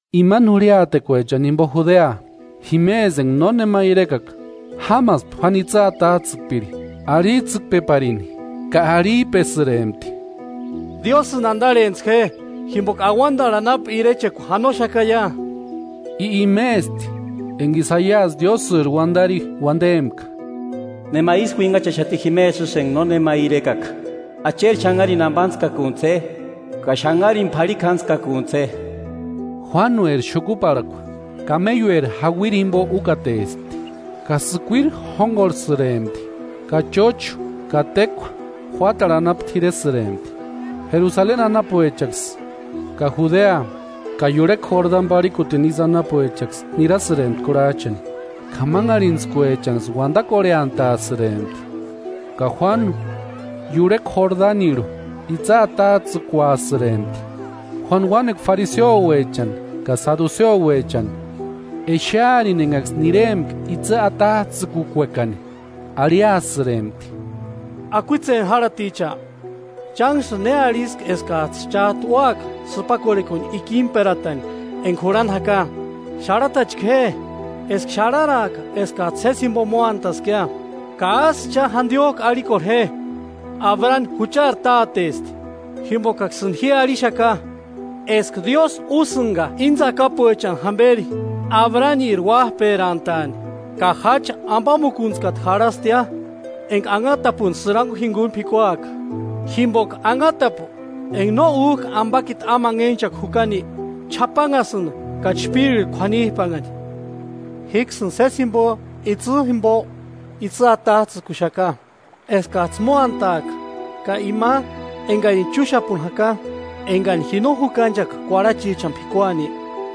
Imani jurhiatekuechani jimpo Judea, jimesï enka nónema irekaka jámaspti Jauánu itsï atats'ïkpiri, arhits'ïkpeparini, ka arhip'esïrempti: “¡Diósïni antarhentsï je, jimpoka auantarhu anapu irechekua janoxakaia!” I imesti enka Isaiasï Diósïri uantari uantempka: “Nema ísï uinhachaxati jimesï isï enka nónema irekaka: Acheri xanharini ampantskakuntsï je, ka xanharini p'arhikjantskakuntsï je.” Juánueri xukuparhakua kameiueri jauiri jimpo úkatespti ka sïkuiri jónkorhesïrempti ka chóchu ka tékua juátarhu anapu t'iresïrempti. Jerusaleni anapuechaksï ka Judea ka iurhekua Jordani parhikutini isï anapuechaksï nirasïrempti kurhach'ani, k'amanharhintskuechanksï uantakorheantasïrempti ka Juánu iurhekua Jordanirhu itsï atats'ïkuasïrempti. Juánu uánekua fariseuechani ka saduseuechani exearini enkaksï niárempka itsï atats'ïkukuekani, arhiasïrempti: “¡Akuitseni járhaticha! ¿Chánksïni ne arhiski eskats'ï chát'u úaka sïpakorhekuni ikimperatani enka jurhani jaka? Xarhatachka je, eska xarharaaka eskats'ï sési jimpo móantaskia, ka ásï cha jantiok'u arhikorhe je: ‘Abrani juchari Tátesti.’ Jimpokaksïni ji arhixaka eska Diósï úsïnka íni tsakapuechani jamperi Abrani uáp'erantaani. Ka jacha ampamuntskata jarhastia enka anhatapuni sïrankua jinkuni p'ikuaka; jimpoka anhatapu enka no úk'a ampakiti amanhech'akua jukani, ch'apanhasïnti ka chpírirhu k'uanip'anhani. Jíksïni sési jimpo itsï jimpok'u itsï atats'ïkuxaka, eskats'ï móataaka, ka ima enkarini chúxapuni jaka, enkani ji no jukanchaka kuarhachichani p'ikuani,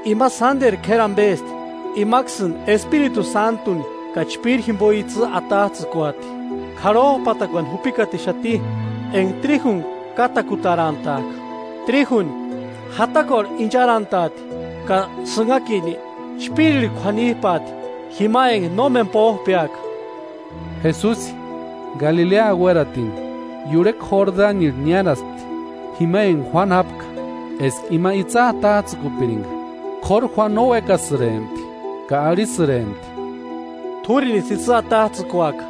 ima sánteru k'éri ampesti. Imaksïni Espiritu Sántuni ka chpíri jimpo itsï atats'ïkuati. K'arhop'atarakuani jupikatixati enka tríjuni kátakutarantaaka. Tríjuni, jatakuarhu incharantaati ka sïnhakini chpírirhu kuanip'aati jima enka nómeni póp'eaka.” Jesusi Galilea uératini, iurhekua Jordanirhu niáraspti, jima enka Juánu jápka, eska ima itsï atats'ïkupirinka. K'óru Juánu no uékasïrempti ka arhisïrempti: –T'úrinisï itsï atats'ïkuaka,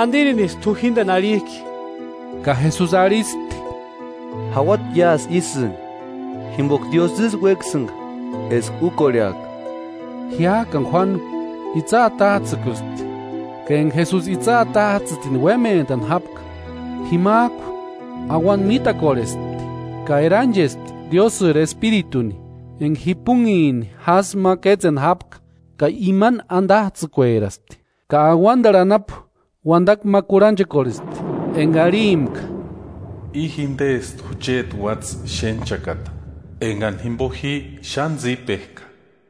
¿Antirinisï t'u jínteni arhik'i? Ka Jesusi arhispti: –Jauati iásï ísïni, jimpoka Diósï ísï uékasïnka eska úkorheaka. Jiák'ani Juánu itsï atats'ïkuspti. Ka enka Jesusi itsï atats'ïtini uémentani jápka, jimak'u auanta mítakorhespti ka eranchespti Diósïri Espirituni enka jipunhini jásï ma kétseni jápka ka imani antats'ïkueraspti. Ka auantarhu anapu uantakua ma kurhanchekorhespti enka arhimpka: “I jintesti jecheti Uátsï xénhchakata, enkani jimpo ji xáni tsípek'a.”